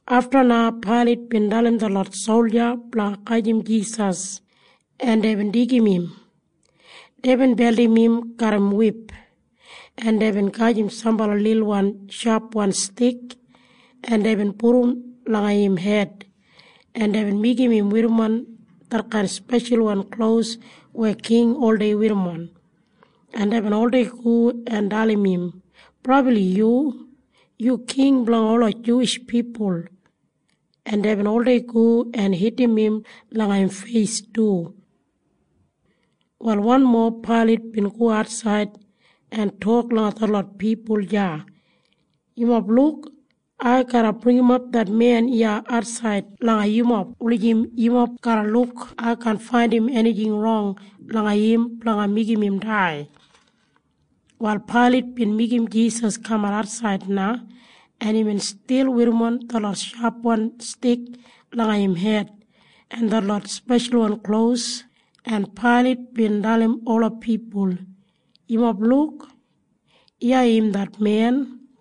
Afta na Pailat bin dalim detlot solja blanga gajim Jisas, en deibin deigim im. Deibin beldim im garram wip, en deibin gajim sambala lilwan shapwan stik, en deibin pudum langa im hed, en deibin meigim im werrimon detkain speshalwan klos weya king oldei werrimon, en deibin oldei go en dalim im, “Brabli yu! Yu king blanga ola Juwish pipul.” En deibin oldei go en hitim im langa im feis du. Wal wanmo Pailat bin go atsaid en tok langa detlot pipul deya, “Yumob luk. Ai garra bringimap det men iya atsaid langa yumob wulijim yumob garra luk ai kaan faindim enijing rong langa im blanga meigim im dai.” Wal Pailat bin meigim Jisas kamat atsaid na, en imbin stil werrimon detlot shapwan stik langa im hed en detlot speshalwan klos, en Pailat bin dalim ola pipul, “Yumob luk. Iya im det men.”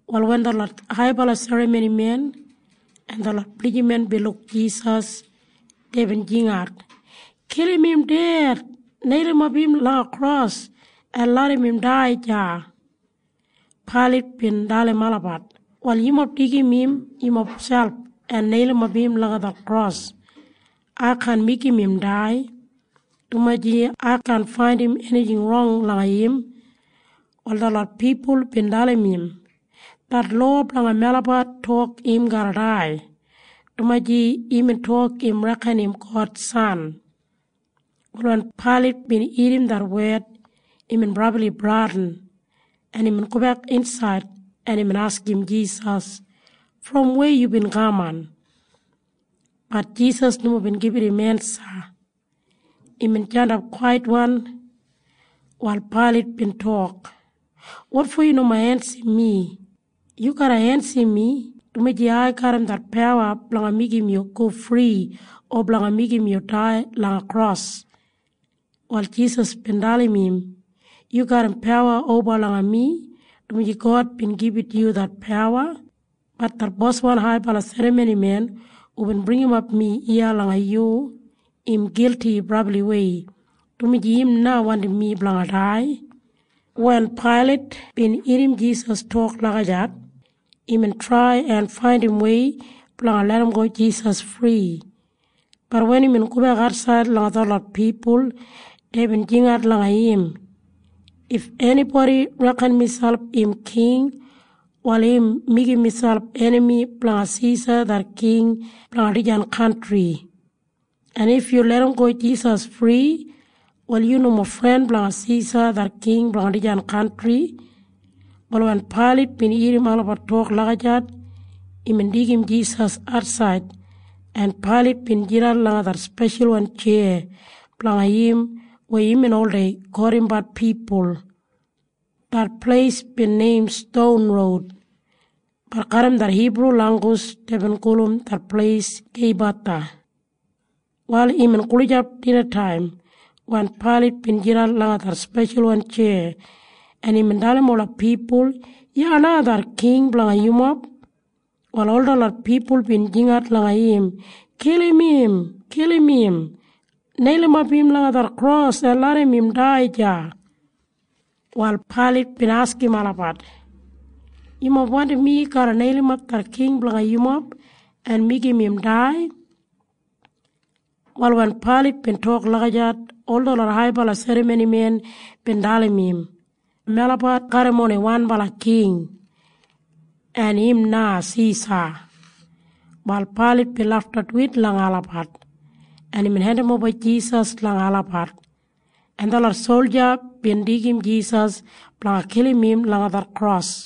Wal wen detlot haibala serramonimen en detlot blijiman bin luk Jisas, deibin jingat, “Kilim im ded! Neilimap im langa kros en larram im dai deya!” Pailat bin dalim olabat, “Wal yumob deigim im yumob selp en neilimap im langa det kros. Ai kaan meigim im dai, dumaji ai kaan faindim enijing rong langa im.” Wal detlot pipul bin dalim im, “Det lowa blanga melabat tok im garra dai, dumaji imbin tok im reken im God San.” Wal wen Pailat bin irrim det wed, imbin brabli bradin, en imbin gobek insaid, en imbin askim Jisas, “Brom weya yubin kaman?” Bat Jisas nomo bin gibit im ensa. Imbin jandap kwaitwan. Wal Pailat bin tok, “Wotfo yu nomo ensim mi? Yu garra ensim mi, dumaji ai garram det pawa blanga meigim yu go fri o blanga meigim yu dai langa kros.” Wal Jisas bin dalim im, “Yu garram pawa oba langa mi, dumaji God bin gibit yu det pawa. Bat det boswan haibala serramonimen hubin bringimap mi iya langa yu, im gilti brabliwei, dumaji im na wandim mi blanga dai.” Wen Pailat bin irrim Jisas tok lagijat, imbin trai en faindim wei blanga larramgo Jisas fri. Bat wen imbin gobek atsaid langa detlot pipul, deibin jingat langa im, “If enibodi reken miselp im king, wal im meigim miselp enami blanga Sisa det king blanga dijan kantri. En if yu larramgo Jisas fri, wal yu nomo fren blanga Sisa det king blanga dijan kantri.” Wal wen Pailat bin irrim olabat tok lagijat, imbin deigim Jisas atsaid, en Pailat bin jidan langa det speshalwan tjeya blanga im weya imbin oldei kotimbat pipul. Det pleis bin neim Ston Roud, bat garram det Hibru langgus deibin gulum det pleis Geibatha. Wal imbin gulijap dinataim wen Pailat bin jidan langa det speshalwan tjeya, en imbin dalim ola pipul, “Iya na det king blanga yumob.” Wal ol detlot pipul bin jingat langa im, “Kilim im! Kilim im! Neilimap im langa det kros en larram im dai deya!” Wal Pailat bin askim olabat, “Yumob wandim mi garra neilimap det king blanga yumob en meigim im dai?” Wal wen Pailat bin tok lagijat, ol detlot haibala serramonimen bin dalim im, “Melabat garram oni wanbala king. En im na Sisa.” Wal Pailat bin lafta duwit langa olabat, en imbin hendimoba Jisas langa olabat, en detlot solja bin deigim Jisas blanga kilim im langa det kros.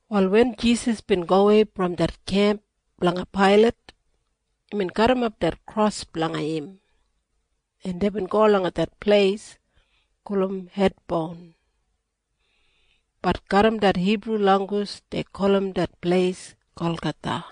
Wal wen Jisas bin gowei brom det kemp blanga Pailat, imbin garrimap det kros blanga im, en deibin go langa det pleis gulum Hed Boun. Bat garram det Hibru langgus dei gulum det pleis Golgatha.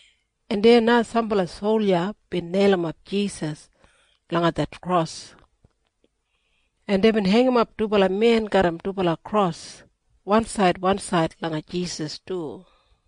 En deya na sambala solja bin neilimap Jisas langa det kros. En deibin heingimap dubala men garram dubala kros wansaid wansaid langa Jisas du.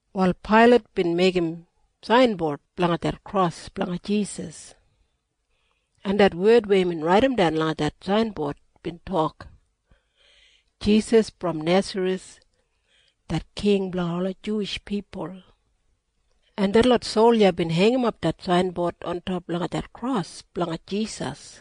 Wal Pailat bin meigim sainbod blanga det kros blanga Jisas, en det wed weya imbin raidimdan langa det sainbod bin tok, “Jisas brom Nesareth det King blanga ola Juwish pipul.” En detlot solja bin heingimap det sainbod ontop langa det kros blanga Jisas.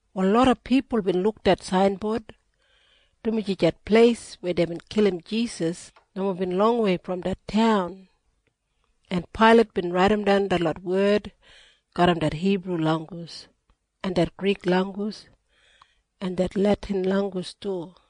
Wal loda pipul bin luk det sainbod, dumaji det pleis weya deibin kilim Jisas nomo bin longwei brom det taun, en Pailat bin raidimdan detlot wed garram det Hibru langgus en det Grik langgus en det Letin langgus du.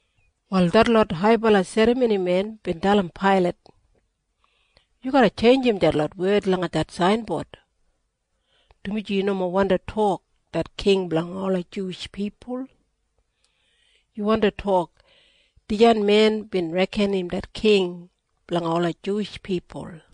Wal detlot haibala serramonimen bin dalim Pailat, “Yu garra tjeinjim detlot wed langa det sainbod, dumaji yu nomo wandi tok, ‘Det King blanga ola Juwish pipul.’ Yu wandi tok, ‘Dijan men bin reken im det King blanga ola Juwish pipul.’”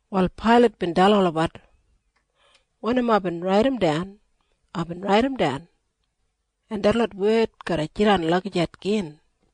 Wal Pailat bin dalim olabat, “Wanim aibin raidimdan, aibin raidimdan. En detlot wed garra jidan lagijat gin.”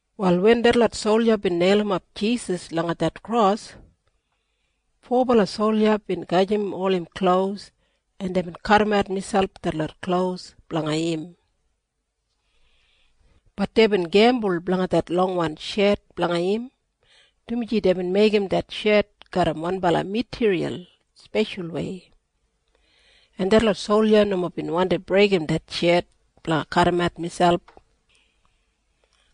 Wal wen detlot solja bin neilimap Jisas langa det kros, fobala solja bin gajim ol im klos, en deibin kadimat miselp detlot klos blanga im. Bat deibin gembul blanga det longwan shet blanga im, dumaji deibin meigim det shet garram wanbala matiriyal speshalwei, en detlot solja nomo bin wandi breigim det shet blanga kadimat miselp.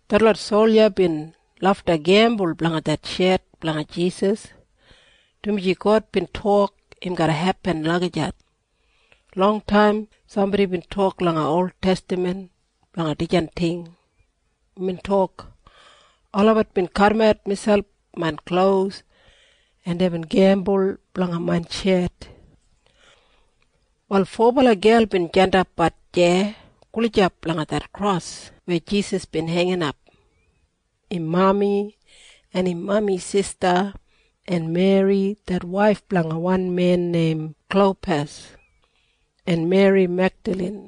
Detlot solja bin lafta gembul blanga det shet blanga Jisas, dumaji God bin tok im garra hepin lagijat. Longtaim sambodi bin tok langa oltestaman blanga dijan ting. Imbin tok, “Olabat bin kadimat miselp main klos, en deibin gembul blanga main shet.” Wal fobala gel bin jandapbat deya gulijap langa det kros weya Jisas bin heinginap. Im mami, en im mami sista, en Meri det waif blanga wan men neim Klopas, en Meri Megdalin.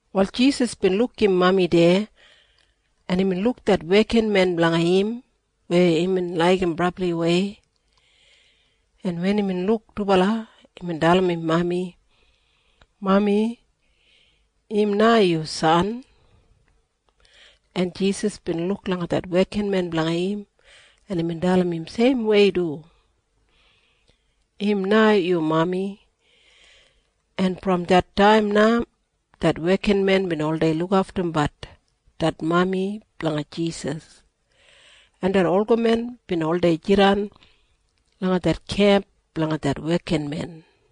Wal Jisas bin luk im mami deya, en imbin luk det wekinmen blanga im weya imbin laigim brabliwei. En wen imbin luk dubala, imbin dalim im mami, “Mami, im na yu san.” En Jisas bin luk langa det wekinmen blanga im, en imbin dalim im seimwei du, “Im na yu mami.” En brom det taim na det wekinmen bin oldei lukaftumbat det mami blanga Jisas, en det olgamen bin oldei jidan langa det kemp blanga det wekinmen.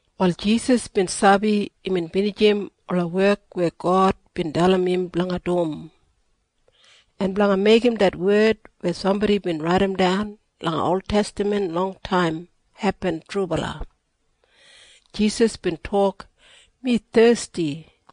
Wal Jisas bin sabi imbin binijim ola wek weya God bin dalim im blanga dum. En blanga meigim det wed weya sambodi bin raidimdan langa oltestaman longtaim hepin trubala, Jisas bin tok, “Mi thesti.”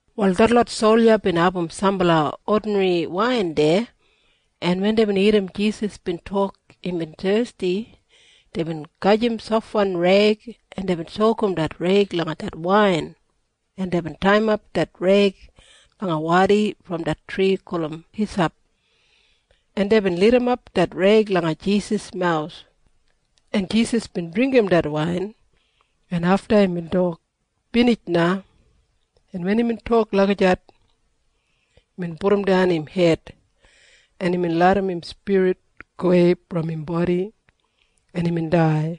Wal detlot solja bin abum sambala odinri wain deya, en wen deibin irrim Jisas bin tok imbin thesti, deibin gajim sofwan reig, en deibin sokum det reig langa det wain, en deibin taiyimap det reig langa wadi brom det tri gulum hisap, en deibin lidimap det reig langa Jisas mawus, en Jisas bin dringgim det wain, en afta imbin tok, “Binij na.” En wen imbin tok lagijat, imbin pudumdan im hed, en imbin larram im spirit gowei brom im bodi, en imbin dai.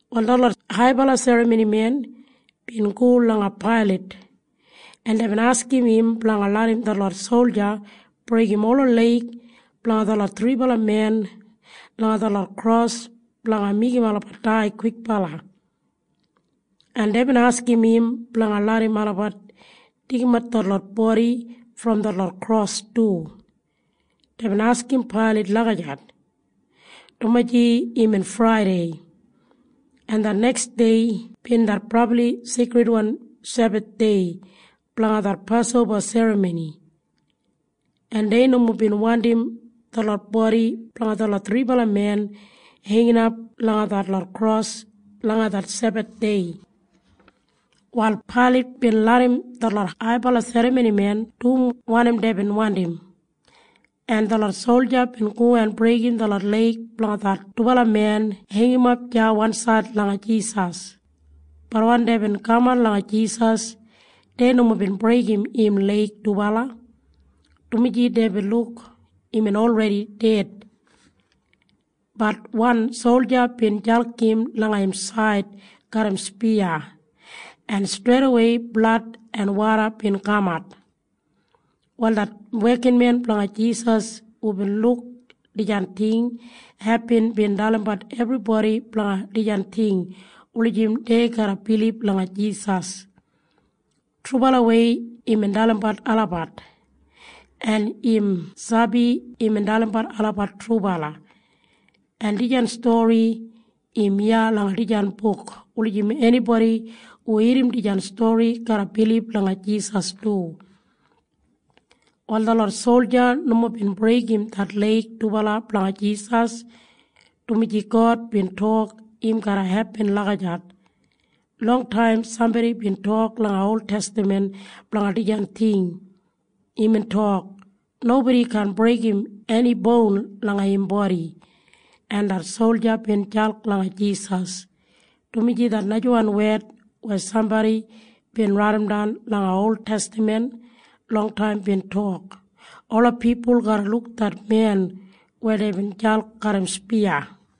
Wal detlot haibala serramonimen bin go langa Pailat, en deibin askim im blanga larram detlot solja breigim ola leig blanga detlot thribala men langa detlot kros blanga meigim olabat dai kwikbala. En deibin askim im blanga larram olabat deigimat detlot bodi brom detlot kros du. Deibin askim Pailat lagijat, dumaji imbin Fraidei, en det neks dei bin det brabli seikridwan Sebathdei blanga det Pasoba Serramoni, en dei nomo bin wandim detlot bodi blanga detlot thribala men heinginap langa detlot kros langa det Sebathdei. Wal Pailat bin larram detlot haibala serramonimen dum wanim deibin wandim, en detlot solja bin go en breigim detlot leig blanga det dubala men heingimap deya wansaid langa Jisas. Bat wen deibin kaman langa Jisas, dei nomo bin breigim im leig dubala, dumaji deibin luk imbin olredi ded. Bat wan solja bin jalk im langa im said garram spiya, en streidawei blad en woda bin kamat. Wal det wekinmen blanga Jisas hubin luk dijan ting hepin bin dalimbat ebribodi blanga dijan ting wulijim dei garra bilib langa Jisas. Trubalawei imbin dalimbat olabat, en im sabi imbin dalimbat olabat trubala. En dijan stori im iya langa dijan buk wulijim enibodi hu irrim dijan stori garra bilib langa Jisas du. Wal detlot solja nomo bin breigim det leig dubala blanga Jisas, dumaji God bin tok im garra hepin lagijat. Longtaim sambodi bin tok langa oltestaman blanga dijan ting. Imbin tok, “Nobodi kaan breigim eni boun langa im bodi.” En det solja bin jalk langa Jisas, dumaji det najawan wed weya sambodi bin raidimdan langa oltestaman longtaim bin tok, “Ola pipul garra luk det men weya deibin jalk garram spiya.”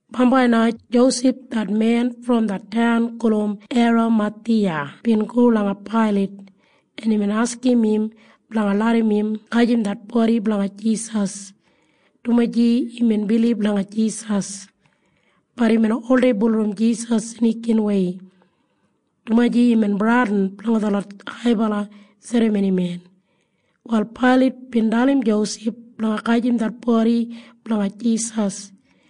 Bambai na Josef det men brom det taun gulum Eramathiya bin go langa Pailat, en imbin askim im blanga larram im gajim det bodi blanga Jisas, dumaji imbin bilib langa Jisas. Bat imbin oldei bulurrum Jisas snikinwei, dumaji imbin bradin blanga detlot haibala serramonimen. Wal Pailat bin dalim Josef blanga gajim det bodi blanga Jisas,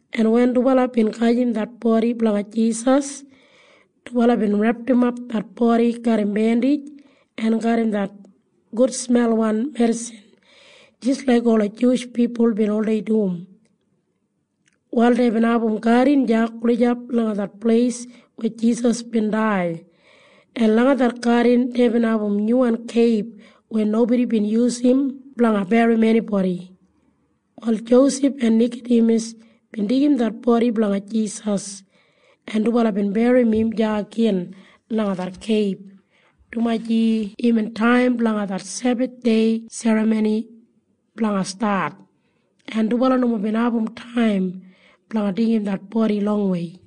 en wen dubala bin gajim det bodi blanga Jisas, dubala bin repdimap det bodi garram bendij en garram det gudsmelwan medisin jis laik ola Juwish pipul bin oldei dum. Wal deibin abum gadin deya gulijap langa det pleis weya Jisas bin dai, en langa det gadin deibin abum nyuwan keib weya nobodi bin yusum blanga berrim enibodi. Wal Josef en Nikadimas bin deigim det bodi blanga Jisas, en dubala bin berrim im deya gin langa det keib, dumaji imbin taim blanga det Sebathdei serramoni blanga stat, en dubala nomo bin abum taim blanga deigim det bodi longwei.